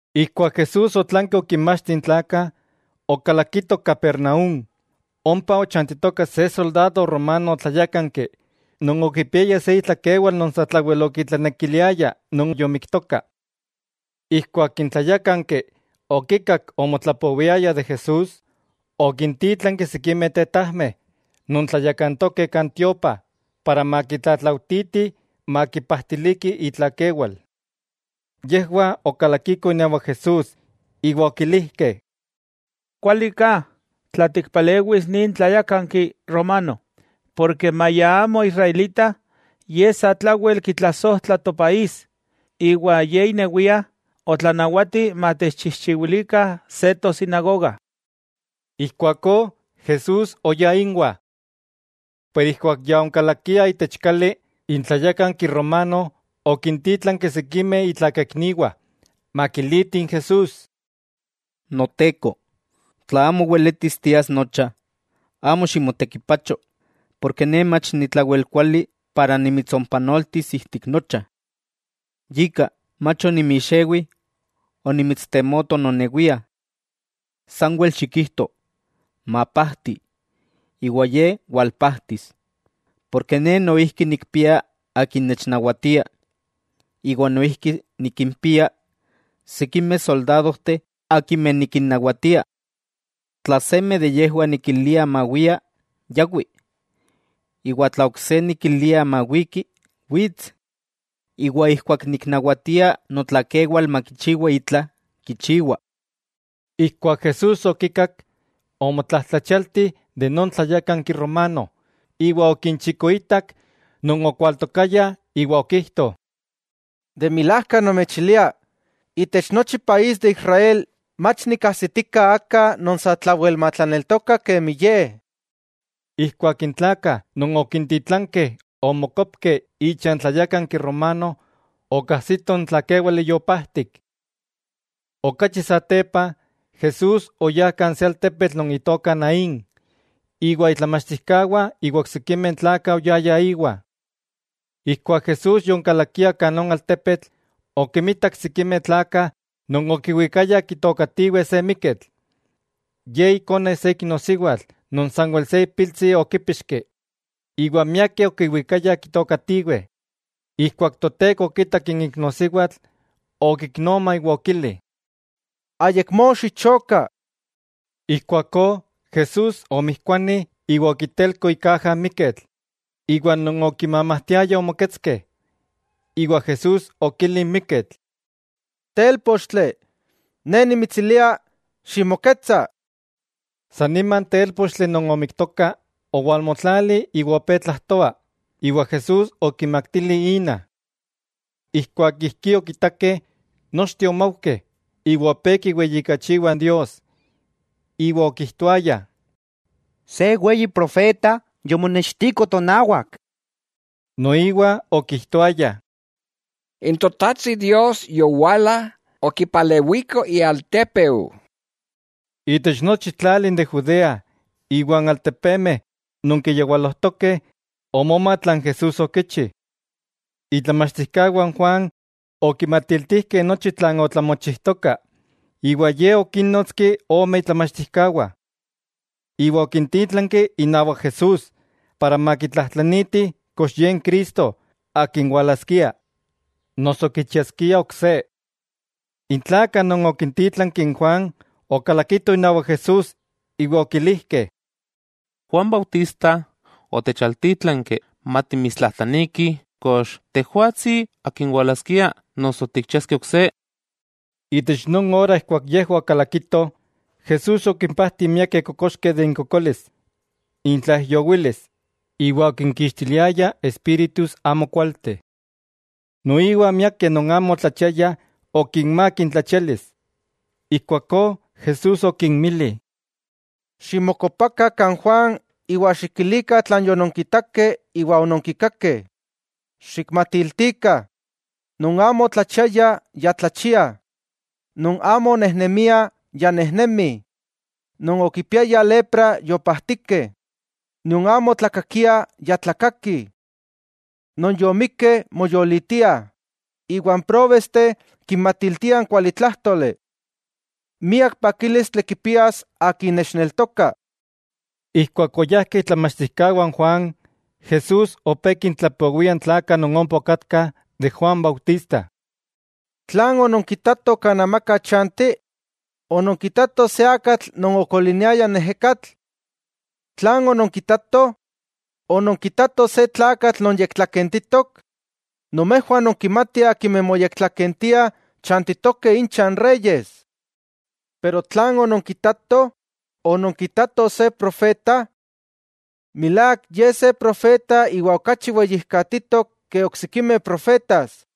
Ijkuak Jesús otlanki okinmachti n tlakah, okalakito Capernaúm. Ompa ochantitoka se soldado romano tlayákanki non okipiaya se itlakewal non satlawel okitlanekiliaya non yomiktoka. Ijkuak n tlayákanki okikak omotlapowiayah de Jesús, okintítlanki sikimeh tetajmeh non tlayakantokeh kan tiopa para makitlatlaujtitih makipajtiliki itlakewal. Yejwah okalakikoh inawak Jesús iwa okilijkeh: —Kuali ka tla tikpalewis nin tlayákanki romano, porke maya amo israelita, ye satlawel kitlasojtla topaís, iwa ye inewia otlanawati matechchijchiwilikah se tosinagoga. Ijkuakó Jesús oyá inwah. Pero ijkuak ya onkalakiah itech kali, n tlayákanki romano okintítlanki sikimeh itlakaikniwah makilitih n Jesús: —Noteko, tla amo weletis tias nocha, amo ximotekipacho, porke ne mach ni tlawel kuali para nimitsompanoltis ijtik nocha. Yika, mach onimixewi onimitstemoto nonewia. Sanwel xikijto “Mapajti”, iwa ye walpajtis. Porke ne noijki nikpia akin nechnawatia, iwa noijki nikimpia sikimeh soldadojteh akimeh nikinnawatia. Tla seme de yejwah nikilia mawia, yawi; iwa tla ok se nikilia mawiki, wits; iwa ijkuak niknawatia notlakewal makichiwa itla, kichiwa. Ijkuak Jesús okikak, omotlajtlachialti non tlayákanki romano, iwa okinchikoitak non okwaltokayah iwa okijto: —De milajka nomechilia, itech nochi país de Israel mach nikkajsitika aka non satlawel matlaneltoka kemi ye. Ijkuak n tlakah non okintitlankeh omokopkeh icha n tlayákanki romano, okajsitoh n tlakéwale yopajtik. Okachi satepa, Jesús oyá kan se altepetl non itoka Naín, iwa itlamachtijkawah iwa oksikimeh tlakah oyayah íwa. Ijkuak Jesús yonkalakia itech non altepetl, okimitak sikimeh tlakah non okiwikayah kitookatiweh se miketl. Ye ikone se iknosiwatl non sanwel se ipiltsi okípixki, iwa miakeh okiwikayah kitookatiweh. Ijkuak Toteko okitak n iknosiwatl okiknoma, iwa okili: —Ayakmó xichoka. Ijkuakó Jesús omijkuani iwa okitelko ikaja n miketl, iwa non okimamajtiayah omoketskeh. Iwa Jesús okili n miketl: —Télpochtli, Ne nimitsilia: ¡Ximoketsa! San nima n télpochtli non omiktoka, owalmotlali iwa opé tlajtoa, iwa Jesús okimaktili ina. Ijkuak ijkí okitakeh, nochteh omaujkeh iwa opé kiweyijkachiwah Dios, iwa okijtoayah: —Se weyi profeta yomonextiko tonawak. Noiwa okijtoayah: —N Totajtsi Dios yowala okipalewiko ialtépeu. Itech nochi n tlali de Judea iwa n altepemeh non kiyawalojtokeh omoma tlan Jesús okichi. Itlamachtijkawah n Juan okimatiltijkeh nochi tlan otlamochijtoka, iwa ye okínnotski ome itlamachtijkawah, iwa okintítlanki inawak Jesús para makitlajtlanitih kox Ye n Cristo Akin walaskia, noso kichiaskiah ok se. N tlakah non okintítlanki n Juan okalakitoh inawak Jesús iwa okilijkeh: —Juan Bautista otechaltítlanki matimitstlajtlanikih kox Tejwatsi Akin walaskia, noso tikchiaskeh ok se. Itech non ora ijkuak yejwah okalakitoh, Jesús okimpajti miakeh kokoxkeh de inkokolis, intlaijyowilis, iwa okinkixtiliaya espíritus amokualteh. Noiwa miakeh non amo otlachiayah okinmák intlachialis. Ijkuakó Jesús okinmili: —Ximokopakah kan Juan iwa xikilikah tlan yononkitakeh iwa ononkikakeh. Xikmatiltikah: non amo otlachiayah, ya tlachiah, non amo onejnemiah, ya nejnemih; non okipiayah lepra, yopajtikeh; non amo otlakakiah, ya tlakakih. Non yomikkeh, moyolitiah, iwa n próbesteh kinmatiltiah n kualitlájtoli. Miak pakílistli kipias akin nechneltokah. Ijkuak oyajkeh itlamachtijkawah n Juan, Jesús opé kintlapowia n tlakah non ompa okatkah de Juan Bautista: —¿Tlan ononkitatoh kan amaka chanti? ¿Ononkitatoh se akatl non okoliniaya n ejekatl? ¿Tlan ononkitatoh? ¿Ononkitatoh se tlakatl non yektlakentitok? Nomejwah nonkimatih akimeh moyektlakentiah, chantitokeh incha n reyes. ¿Tlan ononkitatoh? ¿Ononkitatoh se profeta? Milák, ye se profeta, iwa okachi weyijkatitok ke oksikimeh profetas.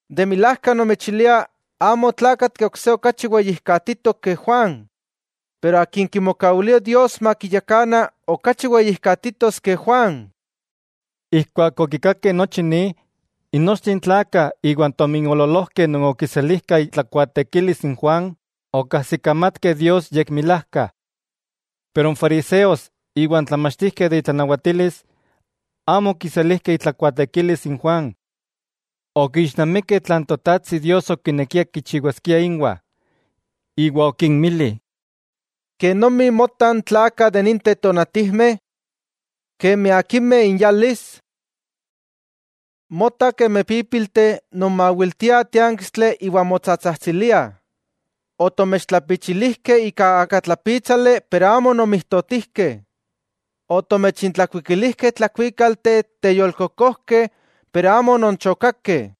De milajka nomechilia amo otlakatki ok se okachi weyijkatitok ke Juan, pero akin kimokawilia Dios makiyakana okachi weyijkatitos ke Juan. Ijkuak okikakeh nochi ni, nochteh n tlakah iwa n tominoololojkeh non okiselijkah itlakuaatekilis n Juan, okajsikamatkeh Dios yekmilajka. Pero n fariseos iwa n tlamachtijkeh de intlanawatilis, amo okiselijkeh itlakuaatekilis n Juan. Okixnamikeh tlan Totajtsi Dios okinekia kichiwaskia inwah. Iwa okinmili: —¿Kenomi motah n tlakah itech ninteh tonatijmeh? ¿Kenomi akimeh inyalis? Mota kemi pípilteh non mawiltia tiánkistli iwa motsatsajtsiliah: “Otomechtlapichilijkeh ika akatlapítsali iwa amo ononmijtotijkeh; otomechintlakuikilijkeh tlakuíkalteh teyolkokojkeh iwa amo ononchokakeh.”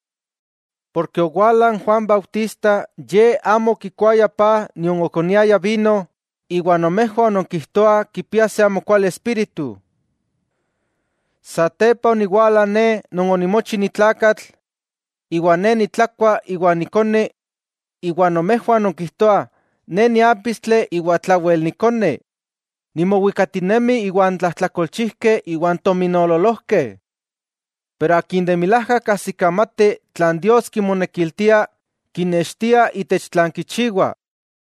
Owala n Juan Bautista, ye amo okikuaya paj nion okoniaya vino, iwa nomejwah nonkijtoah kipia se amokuali espíritu. Satepa oniwala Ne Non onimochi ni tlakatl, iwa Ne nitlakua iwa nikoni, iwa nomejwah nonkijtoah Ne niápistli iwa tlawel nikoni, nimowikatinemi iwan tlajtlakolchijkeh iwan tominoololojkeh. Pero akin de milajka kajsikamati tlan Dios kimonekiltia, kinextia itech tlan kichiwa.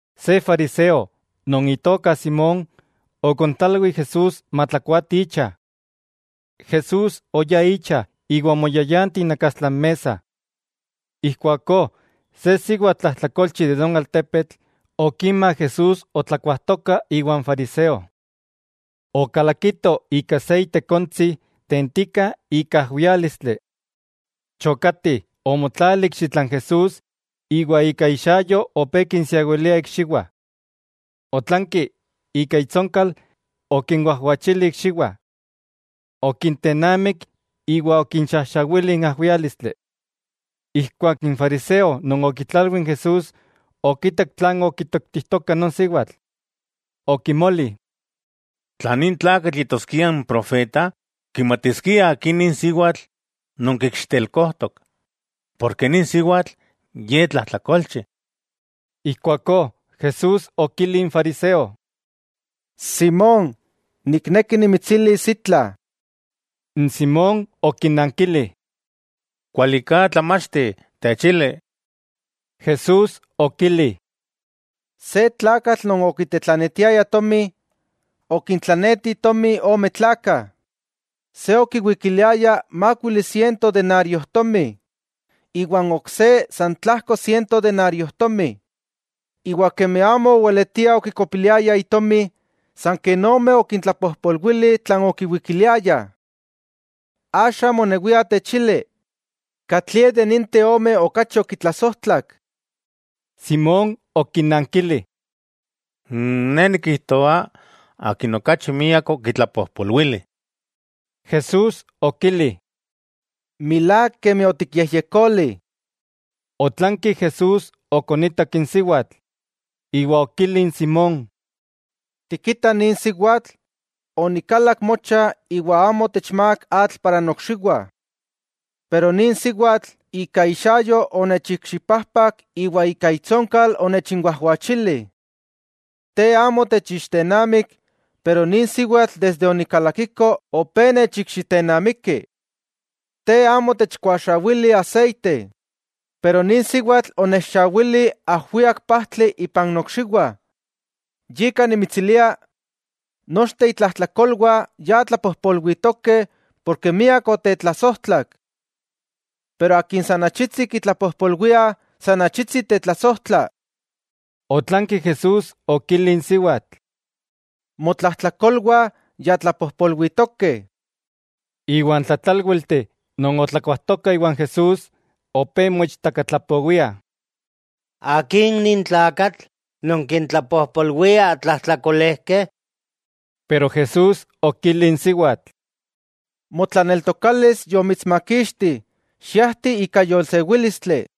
Se fariseo, non itoka Simón, okontlalwi n Jesús matlakuati icha. Jesús oyá icha iwa omoyayanti inakastla n mesa. Ijkuakó se siwatl tlajtlakolchi itech non altepetl, okima Jesús otlakuajtoka iwan fariseo. Okalakito ika se itekontsi tentika ika ajwiálistli. Chokati, omotlali ikxitla n Jesús iwa ika ixayo opé kinsiawilia ikxiwah. Otlanki ika itsonkal okinwajwachili ikxiwah. Okintennamik iwa okinxajxawili n ajwiálistli. Ijkuak n fariseo non okitlalwi n Jesús okitak tlan okitoktijtoka non siwatl, okimoli: “Tla nin tlakatl yetoskia n profeta, kimatiskia aki nin siwatl non kikxitelkojtok, porke nin siwatl, ye tlajtlakolchi.” Ijkuakó Jesús okili n fariseo: —Simón, nikneki nimitsilis itla. N Simón okinankili: —Kuali ka, Tlamachti, techili. Jesús okili: —Se tlakatl non okitetlanetiaya tomi, okintlaneti tomi ome tlakah. Se okiwikiliaya mákuili siento denariojtomi, iwa n ok se san tlajko siento denariojtomi. Iwa kemi amo oweletiah okikopiliayah itomi, san ken omeh okintlapojpolwili tlan okiwikiliayah. Axa monewia techili, ¿katlie de ninteh ome okachi okitlasojtlak? Simón okinankili: —Ne nikijtoa, akin okachi miak okitlapojpolwili. Jesús okili: —Milák kemi otikyejyekoli. Otlanki Jesús okonitak n siwatl, iwa okili n Simón: —¿Tikita nin siwatl? Onikalak mocha, iwa amo otechmák atl para nokxiwah. Pero nin siwatl, ika ixayo onechikxipajpak iwa ika itsonkal onechinwajwachili. Te amo otechixtennamik, pero nin siwatl desde onikalakiko opé nechikxitennamiki. Te amo otechkuaxawili aseite. Pero nin siwatl onechxawili ajwiak pajtli ipan nokxiwah. Yika nimitsilia, nochteh itlajtlakolwah ya tlapojpolwitokeh ken miak otetlasojtlak. Pero akin san achitsi kitlapojpolwiah san achitsi tetlasojtla. Otlanki Jesús okili n siwatl: —Motlajtlakolwah ya tlapojpolwitokeh. Iwa n tlatlálwilteh non otlakuajtokah iwa Jesús, opé moichtakatlapowiah: —¿Akin nin tlakatl, non kintlapojpolwia tlajtlakolejkeh? Jesús okili n siwatl: —Motlaneltokalis yomitsmakixti, xiajti ika yolsewílistli.